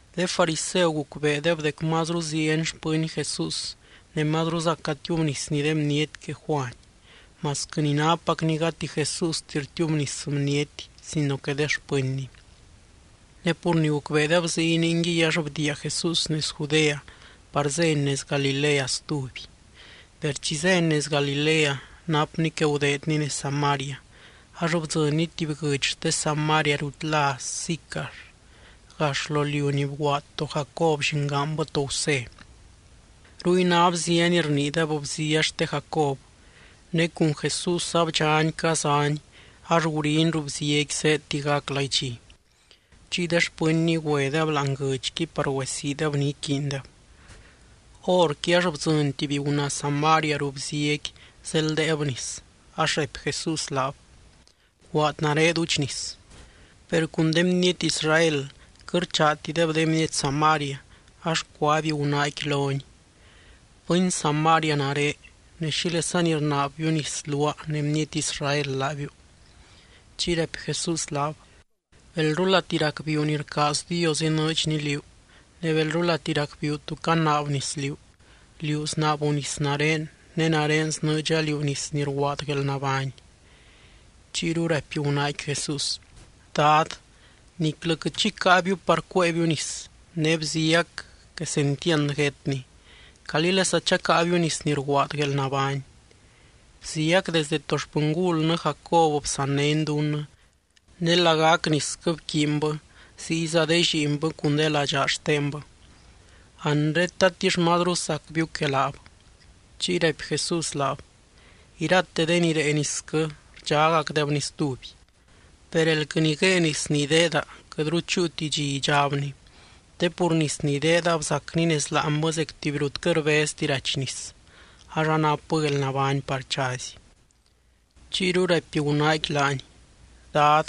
De fariseu gucbeedeb dec mazru zieny xpɨny Jesús ne mazruza catiubnisny de bniety que Juany, (masquɨ ni nápacni gati Jesústi rtiubnis bniety sino que de xpɨnny). Ne pur ni gucbeedeb ziy ningui ax bdiia Jesús nez Judea par zény nez Galilea stuby. Per chi zény nez Galilea napny que gudeedny nez Samaria. Ax bdzɨnny tuby guɨdx xte Samaria rut lá Sicar, gax lo liu ni bguaad to Jacob llingaanbɨ to Gusé. Ruy ná bzia ni rniideb, bzia xte Jacob. Ne cun Jesús abdxany cazany ax guriny ruu bziaqui zéedti gac laidxi. Chiy de xpɨnny güedeb láani guɨdxqui par güesiideb ni iquiindeb. Horqui ax bdzɨny tuby gunaa Samaria ruu bziaqui zeldeeb nis, ax raipy Jesús laab: —Bguaad nare duudx nis. Per cun de bniety Israel quɨt rchaatideb de bniety Samaria, ax cuaby gunaaqui lony: —Bɨny Samaria nare ne, ¿xílesani rnaabbiu nis luaa ne bniety Israel laabiu? Chiy raipy Jesús laab: —Belrulati racbiiu ni rcaaz Dios inɨɨdxny liú, ne belrulati racbiiu tú canaab nis liú, liú snaabu nis nare ne nare snɨɨdxa liú nis ni rguaad guelnabány. Chiyru raipy gunaaqui Jesús: —Dad, niclɨ quɨt xi caabiu par cuéebiu nis, ne bziac quesentiand guétni. ¿Calílesa chacáabiu nis ni rguaad guelnabány? Bziac desdɨ to xpɨngulnɨ Jacob bsannény dunnɨ, ne lagac nisquɨ bquiinbɨ ziyza de lliinbɨ cun de ladxaa xtendeb. Anre, ¿tatix mazru sacbiu que laab? Chiy raipy Jesús laab: —Irate de ni rée nisquɨ rdxágacdebni stuby. Per elquɨ ni guée nis ni ideeda, quɨtru chúuti dxi idxábni. Te pur nis ni ideedab zacni nez láanbɨ zec tuby rut quɨt rbezti rachy nis, ax anapbɨ guelnabány par chazy. Chiyru raipy gunaaqui laany: —Dad,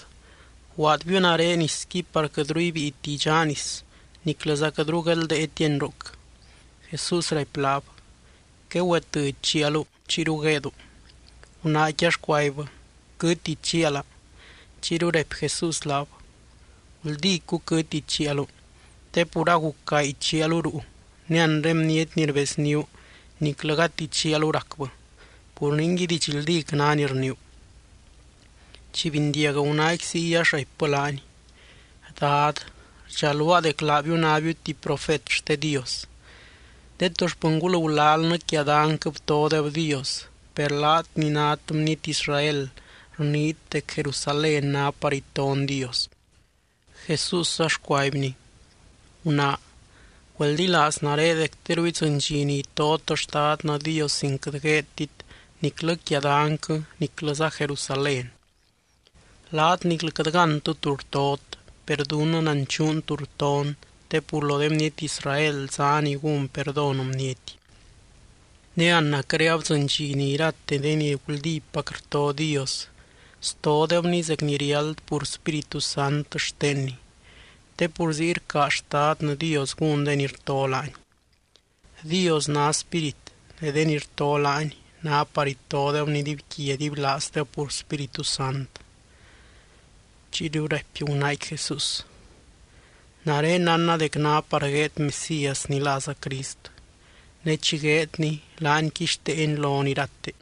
bguaadbiu nare nisqui par quɨtru ibíiti idxaa nis, niclɨza quɨtru guedldéetiani ruc. Jesús raipy laab: —Quegüetɨdx chialu, chiyru gueedu. Gunaaqui ax cuaibbɨ: —Quɨtti chiala. Chiyru raipy Jesús laab: —Guldícu quɨtti chialu te pur aguc gaay chialu ruu, ne anre bniety ni rbezníu niclɨ gati chialu racbɨ. Pur ningui, didxldíc ná ni rniiu. Chi bindiag gunaaqui ziy, ax raipbɨ laany: —Dad, rdxaluaa dec laabiu nábiu tuby profet xte Dios. De to xpɨngul gulalnɨ quia danyquɨ btodeb Dios, per laat ni nát bniety Israel rniit dec Jerusalén ná par iton Dios. Jesús ax cuaibny: —Gunaa, güeldilaaz nare dec teru idzɨny dxi ni itot Xtadnɨ Dios sin quɨt gueedtit niclɨ quia danyquɨ niclɨza Jerusalén. Laat niclɨ quɨt gántɨ tú rtot. Per dunnɨ nanchuun tú rton te pur lo de bniety Israel zá ni gún perdón bniety. Ne anacre abdzɨny dxi ni irate de ni guldípac rto Dios, stodebny zec ni riáld pur Spíritu Sant xtenny. Te pur ziy rcaaz Xtadnɨ Dios gún de ni rto laany. Dios ná Spírit ne de ni rto laany ná par itodebny dibyquia dibylaazdeb pur Spíritu Sant. Chiyru raipy gunaaqui Jesús: —Nare nánna dec ná par gueed Mesías ni láza Crist. Ne chi gueedny laany quixteeny lon irate.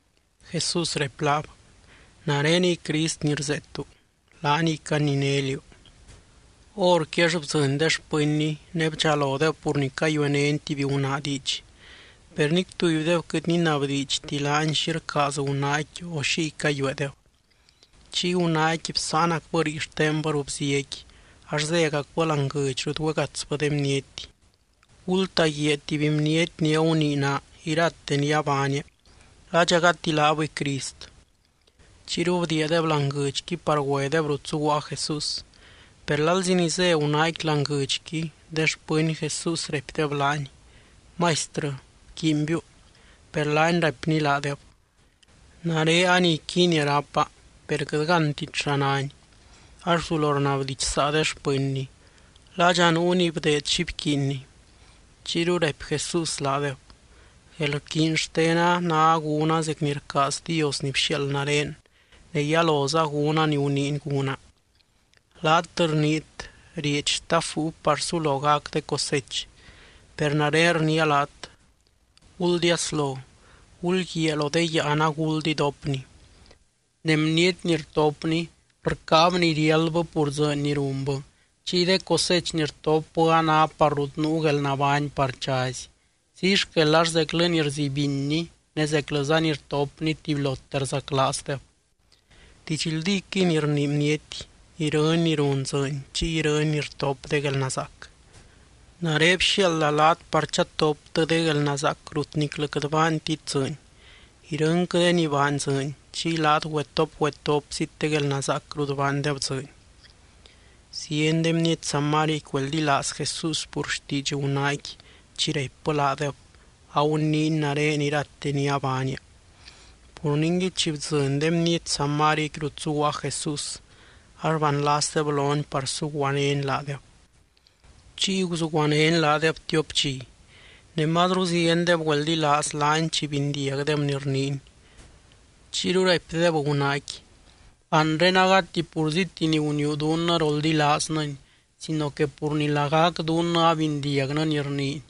Jesús raipy laab: —Nareniy Crist ni rzeetu, laaniy caninény liú. Horqui ax bdzɨny de xpɨnny ne bdxalodeb pur ni cayuenény tuby gunaa diidx. Per nic tubydeb quɨt ninabdiidxti laany xi rcaaz gunaaqui, o xiy cayueedeb. Chiy gunaaqui bsáanacbɨ rii xtenbɨ ruu bziaqui, ax zégacbɨ láani guɨdx rut güegatsbɨ de bniety: —Gultaguiaa tuby bniety ni agunii naa irate ni abaania. ¿Ladxa gati laabɨy Crist? Chiyru bdiiadeb láani guɨdxqui par güedeb rut zuguaa Jesús. Per lalzi ni zé gunaaqui láani guɨdxqui, de xpɨny Jesús raipdeb laany: —Maistrɨ, bquiinbiu. Per laany raipny laadeb: —Nare a ni iquiinia rápa, per quɨt gántit xa náni. Ax guzulo rnabdidxsaa de xpɨnny: —¿Ladxa nuu ni bdeed xi bquiinny? Chiyru raipy Jesús laadeb: —Guelrquiiny xtena ná gúna zec ni rcaaz Dios ni bxiaald nare, ne yaloza gúna ni guniiny gúna. Laat rniit: “Rieedx stap búiu par sulo gac de cosech.” Per nare rniia laat: Guldiaslo, gulguiaa lo de yáan aguld idopni. Ne bniety ni rtopni, rcáab ni riáldbɨ pur dzɨɨny ni runbɨ. Chiy de cosech ni rtopbɨ a ná par rut nuu guelnabány par chazy. Ziy xquel ax zeclɨ ni rzibinni ne zeclɨza ni rtopni tubylote rzaclaazdeb. Didxldíquɨy ni rnii bniety: “Irɨny ni run dzɨɨny chiy irɨny ni rtop de guelnazaac.” Nare bxiaalda laat par chatoptɨ de guelnazaac rut niclɨ quɨt baantit dzɨɨny. Irɨnquɨ de ni baany dzɨɨny, chiy laat güetop, güetopzit de guelnazaac rut baandeb dzɨɨny. Zieny de bniety Samariaqui güeldilaaz Jesús pur xtiidx gunaaqui, chi raipbɨ laadeb: “Aguniiny nare irate ni abaania.” Pur ningui, chi bdzɨny de bniety Samariaqui rut zuguaa Jesús ax banlasdeb lony par suguanény laadeb. Chiy guzuguanény laadeb tiop dxi. Ne mazru ziendeb güeldilaaz laany chi bindiagdeb ni rniiny. Chiyru raipdeb gunaaqui: —Anre agati purzíti ni guniiu dunnɨ roldilaaznɨny sino que pur ni lagac dunnɨ abindiagnɨ ni rniiny.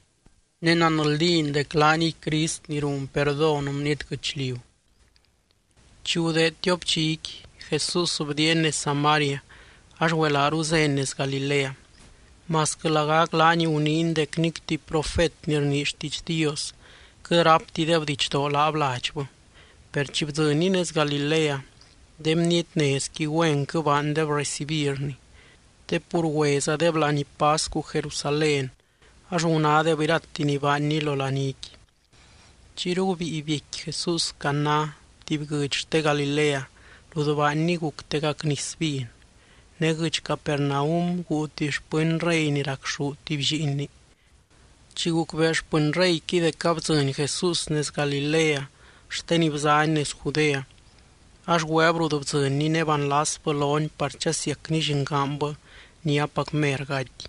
Ne nanldín dec laaniy Crist ni run perdón bniety guɨchliu. Chi gudeed tiop dxiqui, Jesús bdiiany nez Samaria ax güelaaru zény nez Galilea. Masquɨ lagac laany guniiny dec nic tuby profet ni rnii xtiidx Dios quɨt ráptideb didxdoo laab ladxbɨ, per chi bdzɨnny nez Galilea, de bniety nezqui güenquɨ baandeb recibirny. Te pur güézadeb laní pascu Jerusalén ax gunádeb irate ni baanny lo laníqui. Chiyru gubíi biecqui Jesús Caná tuby guɨdx xte Galilea, rut baanny guctegac nis vin. Ne guɨdx Capernaum guu tuby xpɨny rey ni racxú tuby lliinni. Chi gucbee xpɨny reyqui dec abdzɨny Jesús nez Galilea xte ni bzany nez Judea, ax güeb rut bdzɨnny ne banlasbɨ lony par chasiacny llingaanbɨ ni apacmer gaty.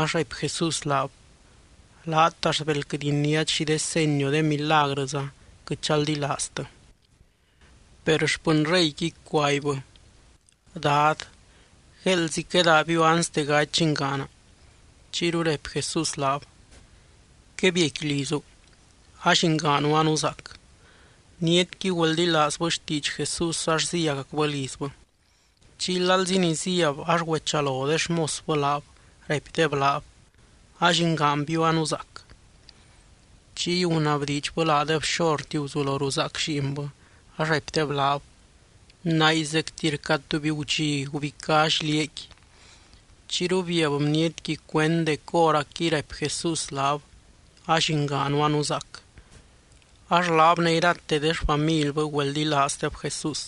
Ax raipy Jesús laab: —Laat axt bel quɨt iniát xi de seny o de milagrɨza, quɨt chaldilaaztɨ. Per xpɨny reyqui cuaibbɨ: —Dad, gueeldzi quedaabiu anste gaty llingaana. Chiyru raipy Jesús laab: —Quebiecqui lizu. A llingaanu anuzaac. Bnietqui güeldilaazbɨ xtiidx Jesús ax zíagacbɨ lizbɨ. Chiy lalzi ni zíab ax güechalo de xmosbɨ laab, raipdeb laab: —A llingaanbiu anuzaac. Chiy gunabdiidxbɨ laadeb xorti guzulo ruzaac lliinbɨ, ax raipdeb laab: —Nay zecti rca tuby gudxi gubicá xliaaqui. Chiyru biab bnietqui cuend dec hóracquiy raipy Jesús laab: “A llingaanu anuzaac.” Ax laab ne irate de xfamilbɨ güeldilaazdeb Jesús.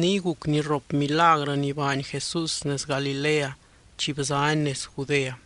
Niy guc ni rrop milagrɨ ni baany Jesús nez Galilea chi bzany nez Judea.